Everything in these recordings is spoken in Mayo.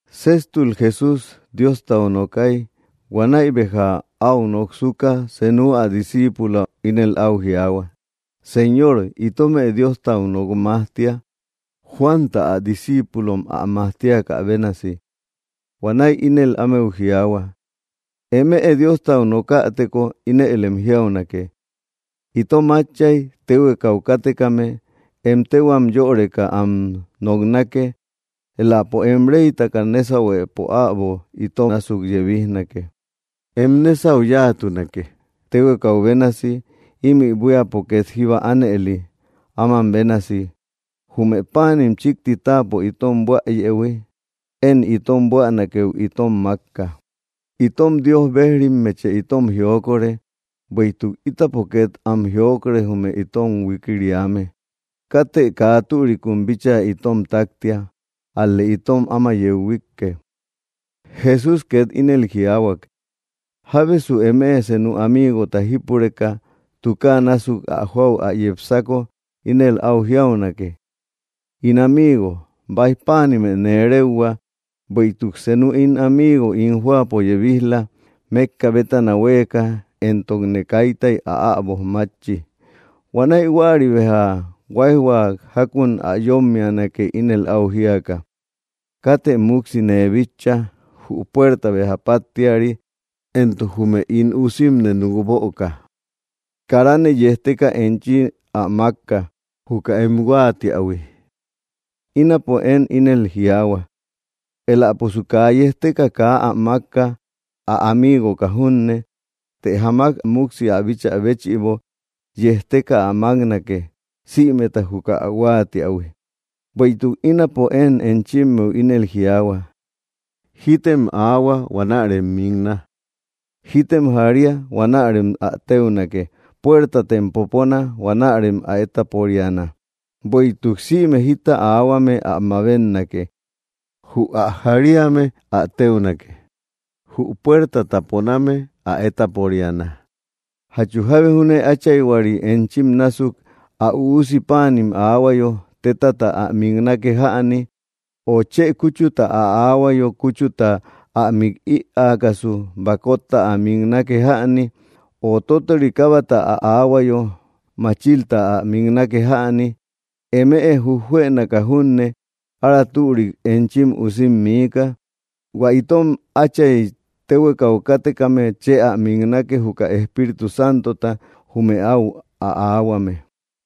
Séjtul Jesús Diostau nookay. Huanäi béja áu noksuka, senu ä disciipulo ínel áu jiaahua: —Señor, itomë Diostau nok majtia, Juanta ä discíipulom ä majtiakä bénasi. Huanäi ínel ámeu jiaahua: —Eme Diostau nokäteko, ínëlem jiaunake: Itom Átchay téhuekau kátekame, em téhuam yöreka am noknake. Éläpo em reytaka nésahuepo äbo ito násuk yebijnake. Em nésau yáatunake, téhuekau bénasi, ímï buíapo két jíba ánëli, áman bénasi. Jume páanim chíkti táapo itom buäyëhui, entok én itom buänakëhui itome am mákka. Itom Dios bejrimmeche itom jiokore, bueïtuk ítapo két am jiokore jume itom huikiriame. Katë kaa türikum bíchaa itom táktia, ál‑lë itom áma yeu huíkke. Jesús ket ínel jiaahuak: —Jábesu eme senu amiigota jípureka, tukaa násuk ä jóau ä yepsako ínel áu jiaunake: ‘‘In amigo, báij páanime nee réuhua. Bueïtuk senu ín amigo ín jóapo yebij‑la, mékka bétana huéeka, éntokne kaita ä äboj mátchi.” Huanäi huäri, béja huáijhua jákun ä yómmianake, ínel áu jíaka: ‘‘Katë múksi nee bitcha. Jü puerta béja páttiari, éntok jume ín usimne núk böka. Karane yejteka enchi ä mákka, juka em huáatiähui.” Ínapo én ínel jiaahua: Éläposu kaa yejteka kaa ä mákka, ä amiigoka junne. Të jamak múksi ä bíchä béchïbo, yejteka ä máknake, sïmeta juka ä huáatiähui. Bueïtuk ínapo én enchimmeu ínel jiaahua: Jítem aahua huanärem mikna; jítem jaria, huanärem ä téunake; puertatem popona, huanärem ä étaporiana. Bueïtuk sïme jita aahuame, ä mabetnake; jü ä jariame ä téunake; jü puertata poname, ä étaporiana. ’¿Jachu jábe júne áchayhuari enchim násuk, ä üusi páanim aahuayo, tétata ä miknake jäni? O, ¿chë kúchuta ä aahuayo, kúchuta ä mik ïaakasu, bakotta ä miknake jäni? O, ¿tótori kábata ä aahuayo, machilta ä miknake jäni? Eme jujjuënaka junne, ára türik enchim usim miika. ¡Hua itom Átchay téhuekau kátekame chë ä miknake, juka Espíritu Santota jume áu ä aahuame!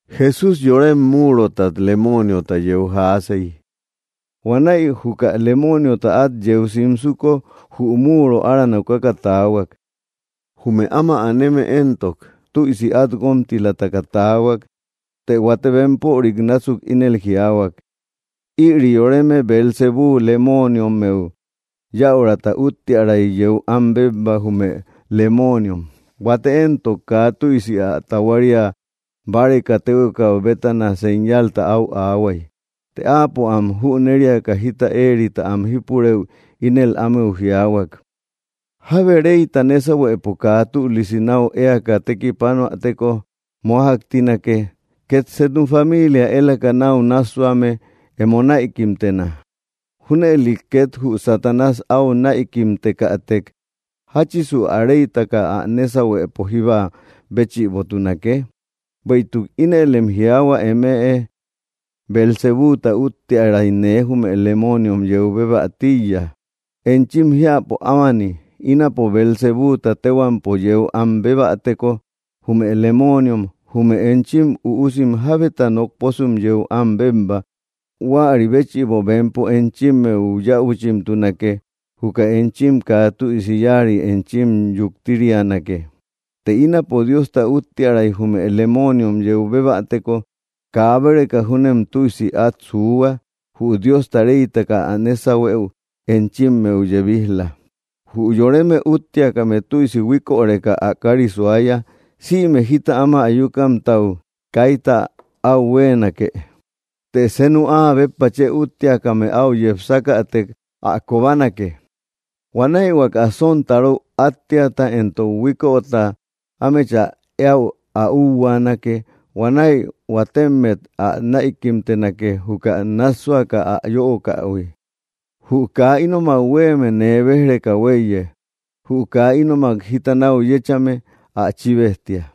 Jesús yorem múurotat lemooniota yeu jaasey. Huanäi juka lemooniota át yeu simsuko, jü múuro ára nokaka taahuak. Jume áma aneme éntok tüisi át guómtilataka taahuak. Të huate bempörim násuk ínel jiaahuak: —Ïri yoreme, Beelzebúu lemooniommeu yäurata úttiäray yeu am bébba, jume lemooniom. Huate éntok kaa tüisi ä tahuaria báreka, téhuekau bétana señalta áu aahuay. Të áapo am jüneriaka jita éerita am jípurëu, ínel ámeu jiaahuak: —Jábe reyta nésahuepo kaa tülisi náu éaka tekipanoäteko mójaktinake. Két senu familia élaka náu nássuame, emo näikimtena. Júnëli két jü Satanás áu näikimtekätek, ¿jáchisu ä reytaka ä nésahuepo jíba béchïbotunake? Bueïtuk ínëlem jiaahua emëe: Beelzebúuta úttiäray nee jume lemooniom yeu bébä tíiya. Enchim jiäpo ámani, ínapo Beelzebúuta téhuampo yeu am bébäteko, jume lemooniom, ¿jume enchim üusim jábeta nokposum yeu am bébba? Huäri béchïbo, bempo enchimmeu yäuchimtunake; juka enchim kaa tüisi yáari enchim yuktirianake. Të ínapo Diosta úttiäray jume lemooniom yeu bébäteko, kaa báreka júnem tüisi át suuhua, jü Diosta reytaka ä nésahueu enchimmeu yebij‑la. ’Jü yoreme úttiakame, tüisi huíköreka, ä kári suaya. Sïme jita áma ayukamtau, kaita áu huéenake. Të senu áa béppa chë úttiakame áu yepsakätek, ä kobanake. Huanäi huaka sontaro áttiata éntok huiköta ámechä éäu ä úhuaanake. Huanäi huatemmet ä näikimtenake, juka nássuaka ä yöokähui. ’Jü kaa ínomak huéeme, nee béj‑reka huéiye. Jü kaa ínomak jita náu yéchame, ä chíbejtia.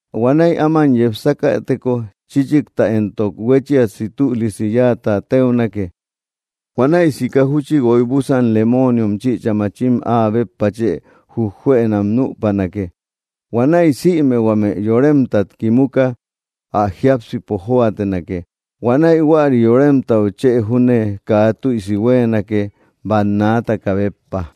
Huanäi áman yepsakäteko, chíchikta éntok huechiasi tülisi yáata téunake. Huanäi sika júchi guoy búsan lemooniom chïcha machim áa béppa chë juejuënam nüpanake. Huanäi sïme huame yoremtat kimuka, ä jiápsipo jóatenake. Huanäi huäri yoremtau chë júne kaa tüisi huéenake, bannaataka béppa.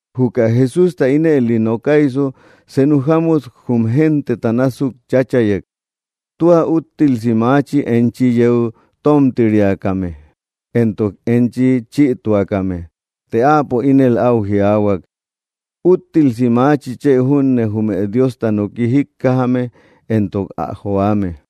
Juka Jesústa ínëli nokaysu, senu jámut jum genteta násuk cháchayek: —¡Tua úttilsi maachi, enchi yeu tómtiriakame, éntok enchi chïtuakame! Të áapo ínel áu jiaahuak: —¡Úttilsi maachi, chë junne, jume Diosta noki jíkkajame, éntok ä joame!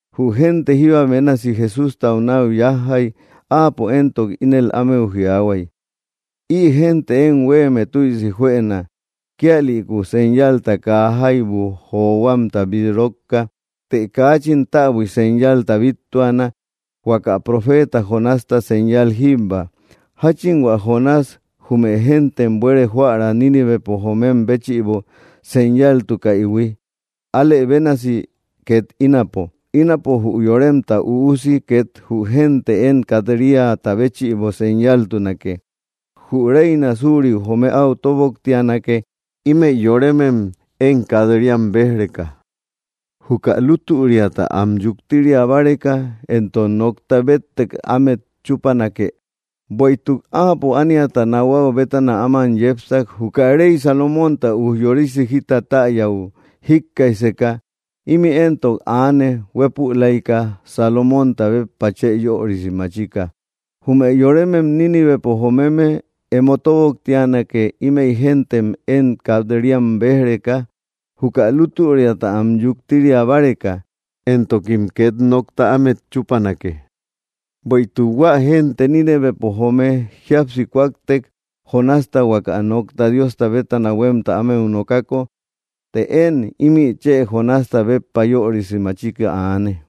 Jü génte jíba bénasi Jesústau náu yájjay. Áapo éntok ínel ámeu jiaahuay: —Ï génte én huéeme tüisi juëna, kíalïku señalta kaa jaibu johuamta bít rókka; të kaachin täbui señalta bíttuana huaka profeeta Jonásta señal jíbba. Jáchin hua Jonás jume géntem buere joära Nínivepo joomem béchïbo señaltukaïhui, alë bénasi két ínapo, ínapo jü Yoremta Üusi ket jü génte én kat‑riata béchïbo señaltunake. Jü reina suuriu joome áu tóboktianake, ímëi yoremem én kat‑riam béj‑reka, juka lútüriata am yuktiria báreka, éntok nokta béttek ámet chúpanake. Bueïtuk áapo ániata nahuau bétana áman yepsak, juka rey Salomónta ujyorisi jita täyäu jíkkaijseka. Ímï éntok aane, huépülaika Salomónta béppa chë yörisi machika. Jume yoremem Nínivepo jomeme emo tóboktianake, ímëi géntem én kat‑riam béj‑reka, juka lútüriata am yuktiria báreka, éntokim két nokta ámet chúpanake: Bueïtuk hua génte Nínivepo joome jíapsi kúaktek, Jonásta huaka nokta Diosta bétana huémta ámeu ä nokako. Të én ímï chë Jonásta béppa yörisi machika aane.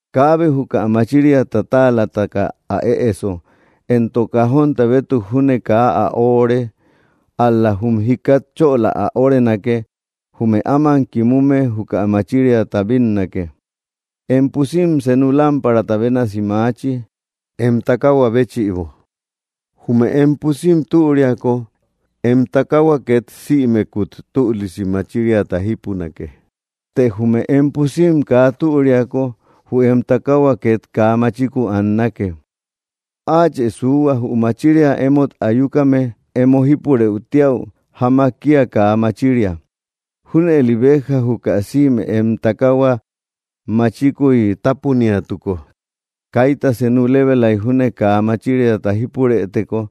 ’Kaabe juka machiriata táalataka ä ëeso, éntok cajónta bétuk junne, kaa ä öore. Ál‑la jum jikat chöla ä órenake; jume áman kimume juka machiriata bínnake. Em pusim senu lámparata bénasi maachi, em takahua béchïbo. Jume em pusim türiako, em takahua két sïmekut tülisi machiriata jípunake. Të jume em pusim kaa türiako, jü em takahua két kaa machiku annake. Áachë suuhua, jü machiria emót ayukame em emo jípurë tíäu jamak kía kaa machiria. Júnëli béja, juka sïme em takahua machikuy tápuniatuko, kaita senu lébelay júne kaa machiriata jípurëteko,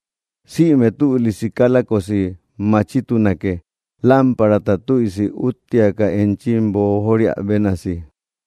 sïme tülisi kálajkosi machitunake, lámparata tüisi úttiaka enchi boojoria bénasi.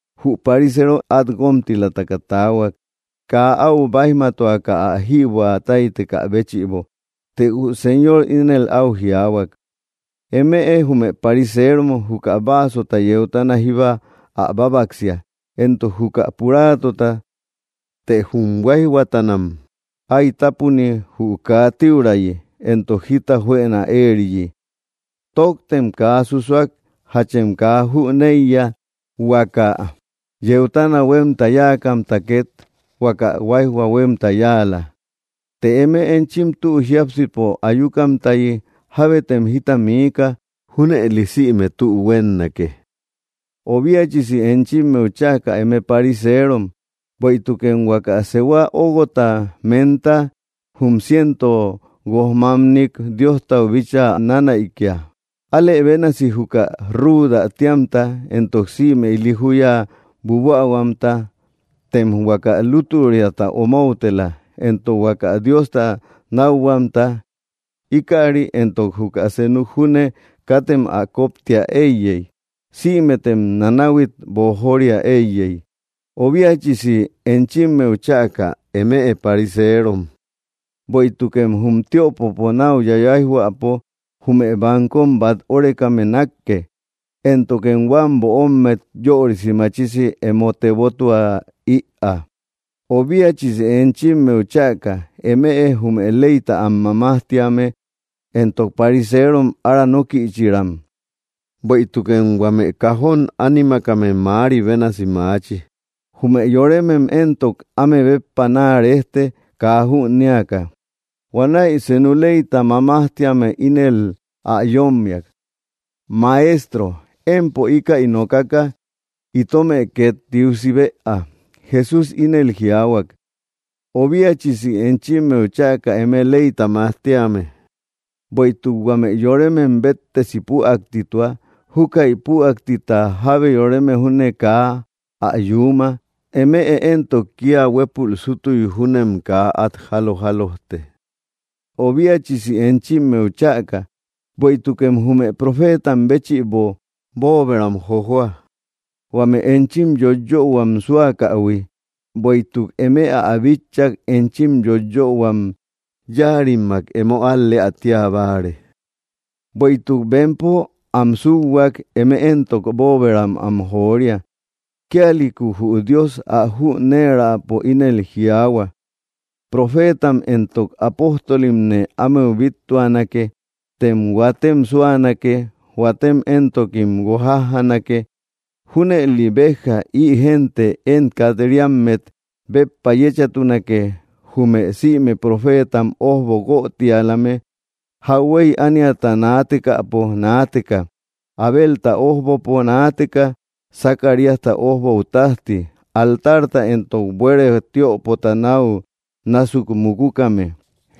Jü pariseero át guómtilataka taahuak, kaa áu báijmatuaka, ä jïbuä táytekä béchïbo. Të jü Señor ínel áu jiaahuak: —Eme jume pariseerom juka vaasota yeutana jíba ä bábaksia, éntok juka puraátota. Të jum huáijhuatanam ái tápuni jü kaa tíurayi, éntok jita juëna éeriyi. ¡Tóktem kaa susuak! ¿Jachem kaa jüneiya, huaka yeutana huémta yáakamta két huaka huáijhua huémta yáala? Të eme enchim tü jiápsipo ayukamtayi, jábetem jita miika. Júnëli sïme tü huénnake. ’¡Obiachisi enchimmeu chäka, eme pariseerom! Bueïtukem huaka sehua óguota menta, jum cientopo guoj mamnik Diostau bíchaa nanäikia. Alë bénasi juka rúuda tíamta, éntok sïme ili júya buabuähuamta. Tem huaka lútüriata omoutela, éntok huaka Diosta nákhuamta. Íkäri éntok juka senuk júne katem ä koptia éiyey, sïmetem nanahuit boojoria éiyey. ’¡Obiachisi enchimmeu chäka, eme pariseerom! Bueïtukem jum tiöpopo náu yayaijhuäpo jume bankom bát órekame nákke, éntokem huam böommet yörisi machisi emo tebotua ïaa. ’¡Obiachisi enchimmeu chäka, eme jume leyta am majtíame éntok pariseerom, ára nókïchiaram! Bueïtukem huame cajón ánimakame mäari bénasi maachi. Jume yoremem éntok áme béppa naa rejte, kaa jünéaka. Huanäi senu leyta mamajtíame ínel ä yómmiak: —Maestro, empo íkäi nokaka itomë két tiusi bëa. Jesús ínel jiaahuak: —¡Obiachisi enchimmeu chäka, eme leyta majtíame! Bueïtuk huame yoremem béttesi püaktitua. Júkäi püaktita jábe yoreme júne kaa ä yuuma. Eme éntok, kía huépul sútuy júnem kaa át jálo jálojte. ’¡Obiachisi enchimmeu chäka! Bueïtukem jume profeetam béchïbo bóoberam jojoa, huame enchim yoiyöhuam súakähui. Bueïtuk eme ä bitchak, enchim yoiyöhuam yáarimmak emo al‑leä tía báare. Bueïtuk bempo am súhuak, eme éntok bóoberam am joria. ’Kíalïku jü Dios ä jüneeräpo ínel jiaahua: ‘‘Profeetam éntok apóstolimne ámeu bíttuanake. Tem huatem súanake. Huatem éntokim guojajjanake.” Júnëli béja ï génte én kat‑riammet béppa yéchatunake, jume sïme profeetam ójbo guötialame jauhuey ániata naatekäpo naateka, Abelta ójbopo naateka Zacaríasta ójbou tájti, altarta éntok buere tiöpota náu násuk mukukame.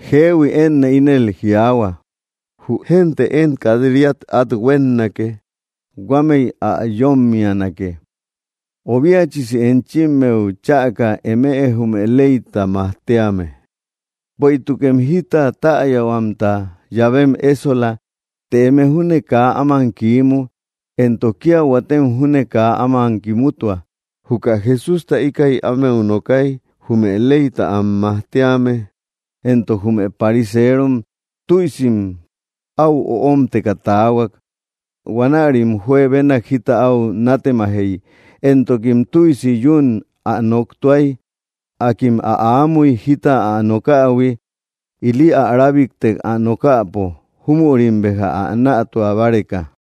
Jeehui, énne ínel jiaahua, jü génte én kat‑riat át huénnake; huamei ä yómmianake. ’¡Obiachisi enchimmeu chäka, eme jume leyta mamajtíame! Bueïtukem jita täyahuamta llavem ésola. Të eme júne kaa áman kiimu, éntok kía huatem júne kaa áman kimutua. Juka Jesústa íkäi ámeu nokay jume leyta am majtíame éntok jume pariseerom tüisim áu öomteka taahuak. Huanärim juebenak jita áu nátemajey, éntokim tüisi yún ä noktuay. Akim ä aamuy jita ä nokähui, ili ä rábiktek ä nokäpo, júmüri béja ä nätua báreka.